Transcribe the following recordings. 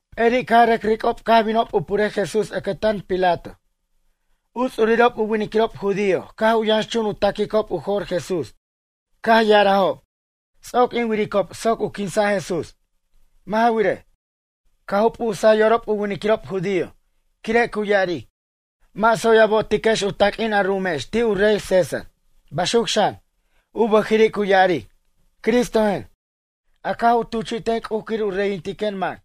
P'eri' caj rʌc ric'ob caj binob purej Jesús ʌcʌtan Pilato. U ts'urirob u winiquirob judío caj u yʌnxchun u ta'quicob u jo'r Jesús caj ya'arajob: ―Ts'oc in wiricob soc u quinsa' Jesús. Mʌ' ja wirej, caj u p'usaj yorob u winiquirob judío. Quire' cu ya'aric: “Mʌ' tsoy a bo'otiquex u taq'uin a ru'umex ti' u rey César.” Baxuc xan, u bʌjiri' cu ya'aric: “Cristojen, a caj u tuchi'ten C'uj quir u reyintiquen mac.”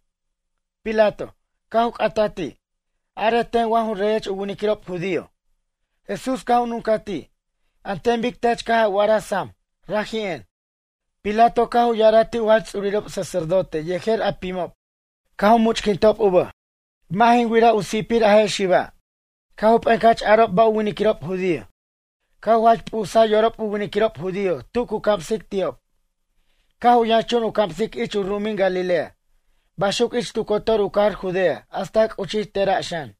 Pilato, caj u c'ata' ti': ―Arej ten wa ju reyech u winiquirob judío? Jesús caj u nuncaj ti': ―An ten bic tech caj a wa'araj sam, raji'en. Pilato caj u ya'araj ti' u jach ts'urirob sacerdote yejer a pimob caj u much'quintob u bʌj: ―Mʌ' jin wiraj u si'pir a je' xiba'. Caj u p'encʌch arob ba' u winiquirob judío: ―Caj u jach p'usaj yorob u winiquirob judío tu cu camsic ti'ob. Caj u yʌnxchun u camsic ich u ru'umin Galilea. Baxuc ich tu cotor u cajar Judea hasta c'uchij tera' xan.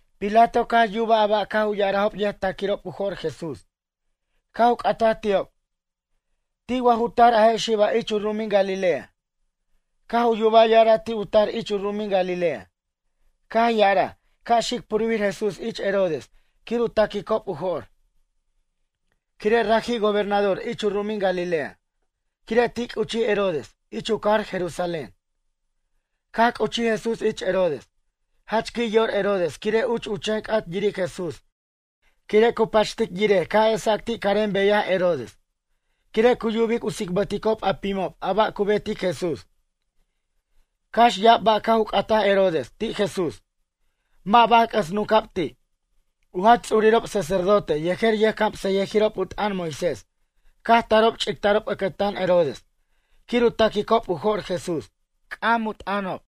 Pilato caj yubaj a ba' caj u ya'arajob yʌjta'quirob u jo'r Jesús. Caj u c'ataj ti'ob: ―Ti' wa ju tar a je' xiba' ich u ru'umin Galilea? Caj u yuba ya'ara' ti' u tar ich u ru'umin Galilea. Caj ya'araj ca' xic purbir Jesús ich Herodes quir u ta'quicob u jo'r. Quire' raji' gobernador ich u ru'umin Galilea. Quire' ti' c'uchij Herodes ich u cajar Jerusalén. Caj c'uchij Jesús ich Herodes, jach qui' yor Herodes quire' uch u chen c'at yiric Jesús quire' cu pachtic yirej ca' esac ti' carem beyaj Herodes. Quire' cu yubic u tsibʌticob a pimob a ba' cu betic Jesús. Cax ya'ab ba' caj u c'ataj Herodes ti' Jesús. Mʌ' baj c'ʌs nunca'b ti'. U jach ts'urirob sacerdote yejer yʌjcamsʌyʌjirob u t'ʌn Moisés caj tarob ch'ictarob ʌcʌtan Herodes quir u ta'quicob u jo'r Jesús. C'am u t'ʌnob.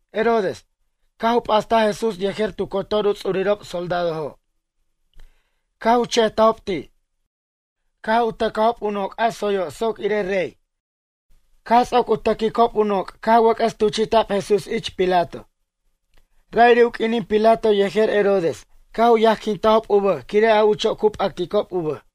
Herodes, caj u p'astaj Jesús yejer tu cotor u ts'urirob soldadojo' caj u chejtajob ti'. Caj u tʌcajob u noc' a tsoyo' soc irej rey. Caj ts'oc u tʌquicob u noc' caj wʌc'ʌs tuchi'ta'b Jesús ich Pilato. Ra'iri' u q'uinin Pilato yejer Herodes caj u yajquintajob u bʌj quire' a ucho' cu p'acticob u bʌj.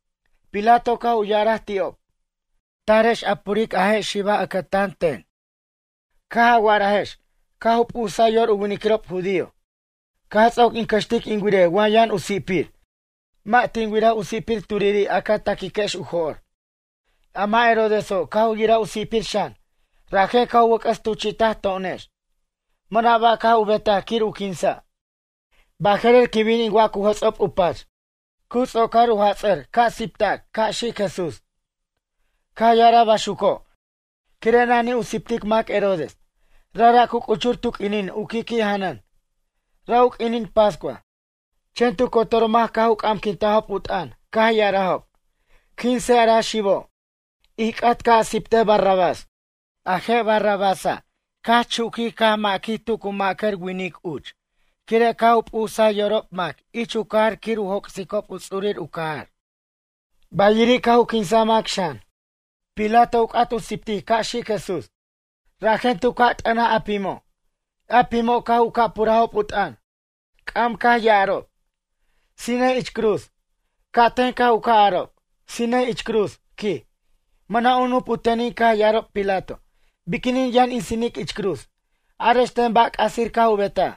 Pilato caj u ya'araj ti'ob: ―Tarex a puric a je' xiba' ʌcʌtan ten. Caj a wa'arajex caj u p'usaj yor u winiquirob judío. Caj ts'oc in cʌxtic in wirej wa yʌn u si'pir, mʌ' tin wiraj u si'pir turiri' a ca ta'quiquex u jo'r. A mʌ' Herodeso' caj u yiraj u si'pir xan. Rajen caj u wʌc'ʌs tuchi'taj to'onex. Mʌna' ba' caj u betaj quir u quinsa'. Baje'rer quin bin in wac u jʌts'ob u pach. Cu ts'ocar u jats'ʌr ca' sipac ca' xic Jesús. Caj ya'araj baxuco' quire' nanij u sipic mac Herodes, rajra' cu c'uchur tu q'uinin u qui'qui' janʌn, ra' u q'uinin pascua. Chen tu cotor mac caj u c'amquintajob u t'ʌn, caj ya'arajob: ―Quinsej a ra xibo'. Ij c'at ca' a siptej Barrabás. A je' Barrabása' caj chuquij caj maquij tu cu ma'cʌr winic uch quire' caj u p'usaj yorob mac ich u cajar quir u joc'sicob u ts'urir u cajar. Bayiri' caj u quinsaj mac xan. Pilato u c'at u siptic ca' xic Jesús, rajen tu ca' t'ʌnaj a pimo'. A pimo' caj u ca' purajob u t'ʌn. C'am caj ya'arob: ―Sinej ich cruz. Ca' ten caj u ca' arob: ―Sinej ich cruz ―quij. Mʌna' u nup u tenin caj ya'araj Pilato: ―Biquinin yʌn in sinic ich cruz? Arex ten ba' c'asir caj u betaj?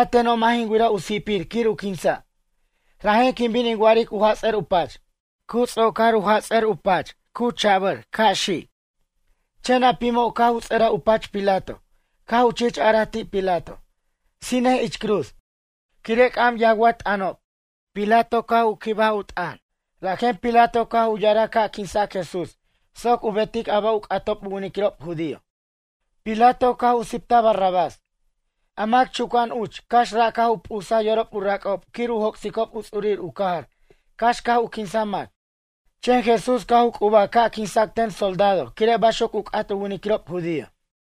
A teno' mʌ' jin wiraj u si'pir quir u quinsa'. Rajen quin bin in wa'aric u jats'ʌr u pach. Cu ts'ocar u jats'ʌr u pach, cu chabʌr ca' xic. Chen a pimo' caj u ts'ʌraj u pach Pilato, caj u chich araj ti' Pilato: ―Sinej ich cruz. Quire' c'am yawʌt t'ʌnob. Pilato caj u quibaj u t'ʌn. Rajen Pilato caj u ya'araj ca' quinsac Jesús soc u betic a ba' u c'atob u winiquirob judío. Pilato caj u siptaj Barrabás, a mac chuca'an uch cax ra' caj u p'usaj yorob u rac'ob quir u joc'sicob u ts'urir u cajar cax caj u quinsaj mac. Chen Jesús caj u c'ubaj ca' quinsa' ten u soldado quire' baxuc u c'at u winiquirob judío.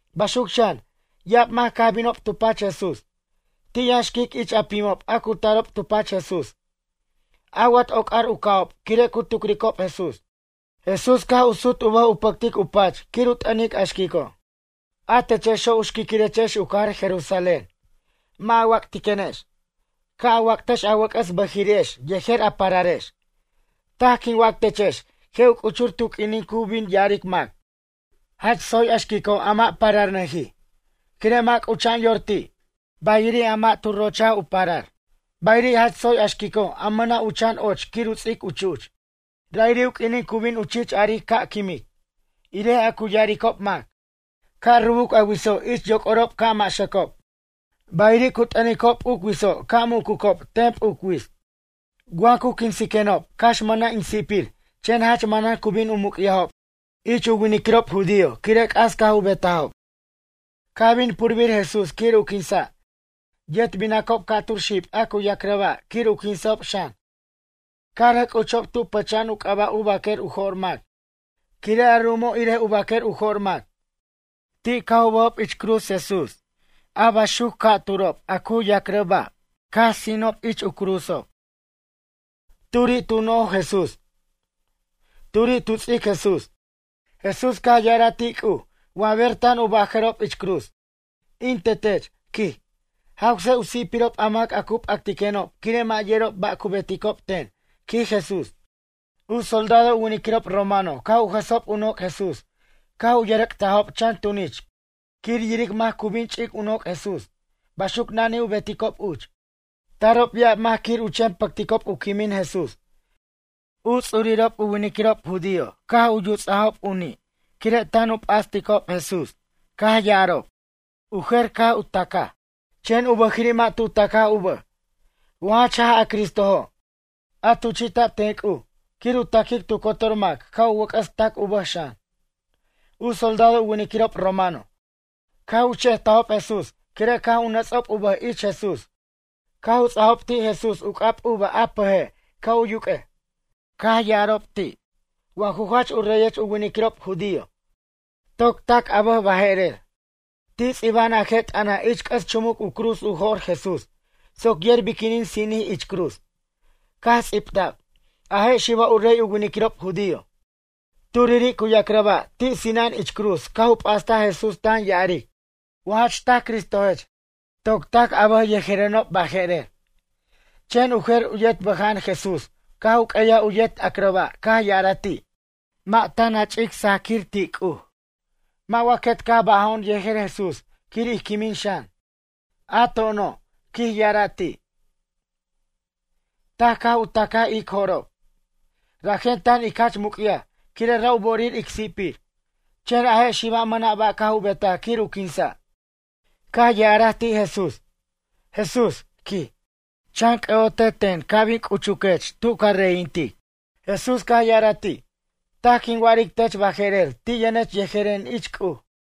Baxuc xan, ya'ab mac caj binob tu pach Jesús. Ti' yʌn xquic ich a pimob a cu tarob tu pach Jesús. Awʌt oc'ar u ca'ob quire' cu tucricob Jesús. Jesús caj u sut u bʌj u pʌctic u pach quir u t'ʌnic a xquico': ―A techexo' u xquiquirechex u cajar Jerusalén. Mʌ' a wac'tiquenex. Ca' a wactex a wʌc'ʌs bʌjiri'ex yejer a pararex. Taj quin wac techex je' u c'uchur tu q'uinin cu bin ya'aric mac: “Jach tsoy a xquico' a mʌ' pararnʌjij. Quire' mʌ' c'ucha'an yor ti'. Bayiri' a mʌ' tu rochaj u parar. Bayiri' jach tsoy a xquico' a mʌna' u chan och quir u ts'ic chu'ch.” Ra'iri' u q'uinin cu bin u chich aric ca' quimic, irej a cu ya'aricob mac. Ca' rubuc a witso' ich yoc'orob ca' maxʌcob. Bayiri' cu t'ʌnicob p'uc witso' ca' mucucob, ten p'uc wits. Wa cu quinsiquenob cax mʌna' in si'pir chen jach manan cu bin u muc'yajob ich u winiquirob judío quire' c'as caj u betajob. Caj bin purbir Jesús quir u quinsa', yet binacob ca'tur xib a cu yacrʌ ba' quir u quinsa'ob xan. Caj rʌc c'uchob tu pʌcha'an u c'aba' u baquer u jo'r mac quire' a ru'umo' irej u baquer u jo'r mac. Ti' caj u bʌjob ich cruz, Jesús a baxuc a cu yacrʌ ba' ca'turo' caj sinob ich u cruzob. Turi' tu noj Jesús, turi' tu ts'ic Jesús. Jesús caj ya'araj ti' C'uj wa ber tan u bajarob ich cruz: ―In Tetech ―quij―, jawse u si'pirob a mac a cu p'actiquenob quire' mʌ' yerob ba' cu beticob ten ―quij Jesús. U soldado u winiquirob romano caj u jʌsob u noc' Jesús caj u yʌrʌc'tajob chan tunich quir yiric mac cu bin u ch'ic u noc' Jesús, baxuc nanij u beticob uch. Tarob ya'ab mac quir u chen pʌcticob u quimin Jesús. U ts'urirob u winiquirob judío caj u yuts'ajob u ni' quire' tan u p'asticob Jesús, caj ya'arob: ―U jer caj u tacaj; chen u bʌjiri' mʌ' tu tacaj u bʌj, wa jach jaj a Cristojo', a tuchi'ta'b ten C'uj quir u taquic tu cotor mac ca' u wʌc'ʌs tac u bʌj xan. U soldado u winiquirob romano, caj u chejtajob Jesús quire' caj nʌts'ob u bʌj ich Jesús caj u ts'ajob ti' Jesús u c'ab uva a pʌje' ca' u yuq'uej. Caj ya'arob ti': ―Wa ju jach u reyech u winiquirob judío, toc tac a bʌj baje'rer. Ti' ts'iba'an a je' t'ʌna' ich c'ʌs chumuc u cruz u jo'r Jesús soc yer biquinin sinij ich cruz. Caj ts'ibta'b: “A je' xiba' u rey u winiquirob judío.” Turiri' cu yacrʌ ba' ti' sina'an ich Jesús caj u p'astaj Jesús tan ya'aric: ―Wa jach taj Cristojech toc tac a bʌj yejerenob baje'rer. Chen u jer u yet bʌja'an Jesús caj u q'ueyaj u yet acrʌ ba' caj ya'araj ti': ―Mʌ' tan a ch'ic sajʌquir ti' C'uj. Mʌ' wa quet caj bʌjo'on yejer Jesús quir ij quimin xan? A to'ono' ―quij ya'ara' ti'―, taj caj u tacaj ic jo'rob, rajen tan ic jach muc'yaj quire' ra' u bo'orir ic si'pir. Chen a je' xiba' mʌna' ba' caj u betaj quir u quinsa'. Caj ya'araj ti' Jesús: ―Jesús ―quij―, chan c'ʌ'ote ten ca' bin c'uchech tu ca reyintic. Jesús caj ya'araj ti': ―Taj quin wa'aric tech baje'rer ti' yʌnech yejeren ich C'uj.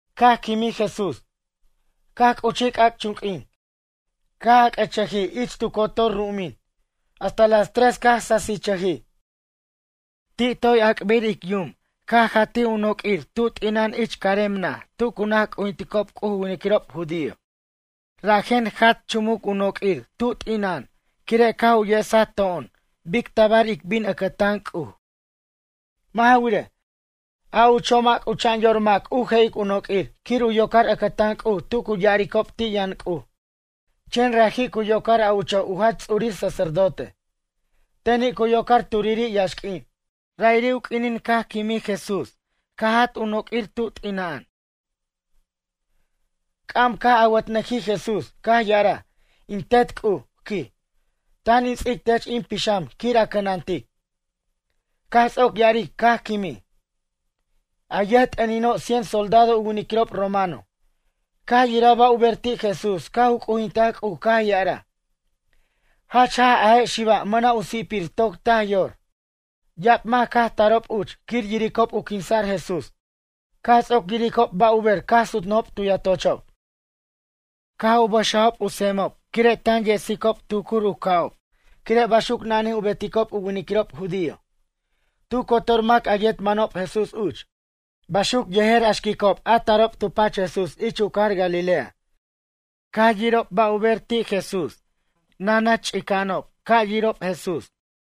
Caj c'uchij c'ac'chunq'uin caj ac'ʌ'chʌjij ich tu cotor ru'umin. Hasta las tres caj sasichʌjij. Ti' toy ac'bir ic yum caj jatij u noq'uir tub t'ina'an ich carem naj tu cu naj c'ujinticob C'uj u winiquirob judío. Rajen jat chumuc u noq'uir tub t'ina'an quire' caj u yesaj to'on bic tabar ic bin ʌcʌtan C'uj. Mʌ' ja wirej, a ucho' mʌ' c'ucha'an yor mac u je'ic u noq'uir quir u yocar ʌcʌtan C'uj tu cu ya'aricob ti' yʌn C'uj. Chen raji' cu yocar a ucho' u jach ts'urir sacerdote. Teni' cu yocar turiri' yaxq'uin. Ra'iri' u q'uinin caj quimij Jesús caj jat u noq'uir ti' t'ina'an. C'am caj awʌtnʌjij Jesús caj ya'araj: ―In Tet C'uj ―quij―, tan in ts'ic tech in pixam quir a cʌnantic. Caj ts'oc ya'aric caj quimij. A yʌjt'ʌnino' cien soldado u winiquirob romano, caj yiraj ba' u ber ti' Jesús caj u c'ujintaj C'uj caj ya'araj: ―Jach jaj a je' xiba' mʌna' u si'pir toc taj yor. Ya'ab mac caj tarob uch quir yiricob u quinsa'r Jesús. Caj ts'oc yiricob ba' u ber caj sutnʌjob tu yatochob. Caj u pʌxajob u semob quire' tan yesicob tucur u ca'ob quire' baxuc nanij u beticob u winiquirob judío. Tu cotor mac a yet manob Jesús uch. Baxuc yejer a xquicob a tarob tu pach Jesús ich u cajar Galilea. Caj yirob ba' u ber ti' Jesús nanach chica'anob caj yirob Jesús.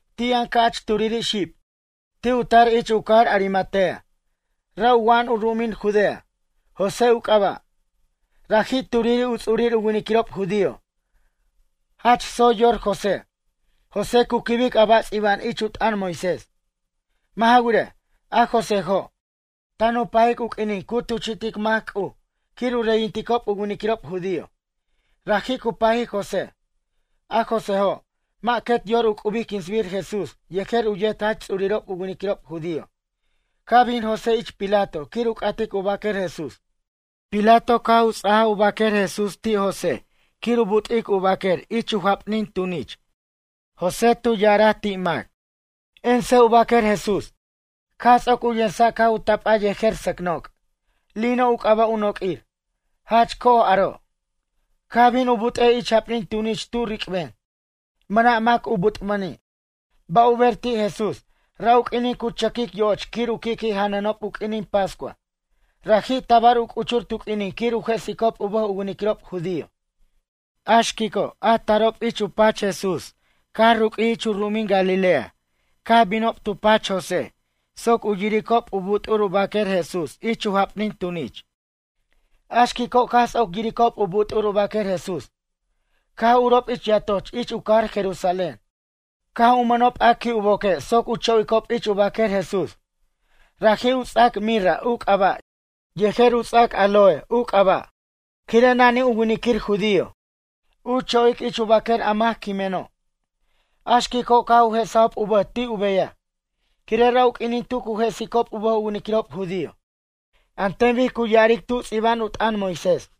Ti' yʌn ca'ch turiri' xib, ti' u tar ich u cajar Arimatea, ra' u wa'an u ru'umin Judea. José u c'aba'. Raji' turiri' u ts'urir u winiquirob judío. Jach tsoy yor José, José cu quibic a ba' ts'iba'an ich u t'ʌn Moisés. Mʌ' ja wirej, a Joséjo', tan u pajic u q'uinin cu tuchi'tic mac C'uj quir u reyinticob u winiquirob judío. Raji' cu pajic José. A Joséjo', mʌ' quet yor u c'ubic quinsbir Jesús yejer u yet jach ts'urirob u winiquirob judío. Caj bin José ich Pilato quir u c'atic u baquer Jesús. Pilato caj u ts'aj u baquer Jesús ti' José quir u but'ic u baquer ich japnin tunich José, cu ya'araj ti' mac: ―Ensej u baquer Jesús. Caj ts'oc u yensa' caj u tapaj yejer sʌc noc', lino u c'aba' u noq'uir, jach co'oj aro'. Caj bin u but'ej ich japnin tunich tu ric'ben, mʌna' mac u but'mʌni'. Ba' u ber ti' Jesús. Ra' u q'uinin cu chʌquic yoch quir u qui'qui' janʌnob u q'uinin pascua. Raji' tabar u c'uchur tu q'uinin quir u jesicob u bʌj u winiquirob judío. A xquico' a tarob ich u pach Jesús caj ruq'uij ich u ru'umin Galilea caj binob tu pach José soc u yiricob u but'ur u baquer Jesús ich japnin tunich. A xquico' caj ts'oc yiricob u but'ur u baquer Jesús. Caj urob ich yatoch ich u cajar Jerusalén. Caj u mʌnob a qui' u boque' soc u cho'icob ich u baquer Jesús. Raji' u ts'ac mirra u c'aba' yejer u ts'ac aloe u c'aba' quire' nanij u winiquir judío, u cho'ic ich u baquer a mac quimeno'. A xquico' caj u jesajob u bʌj ti' u beyaj. Quire' ra' u q'uinin tu cu jesicob u bʌj u winiquirob judío. An ten bic cu ya'aric tu ts'iba'an u t'ʌn Moisés.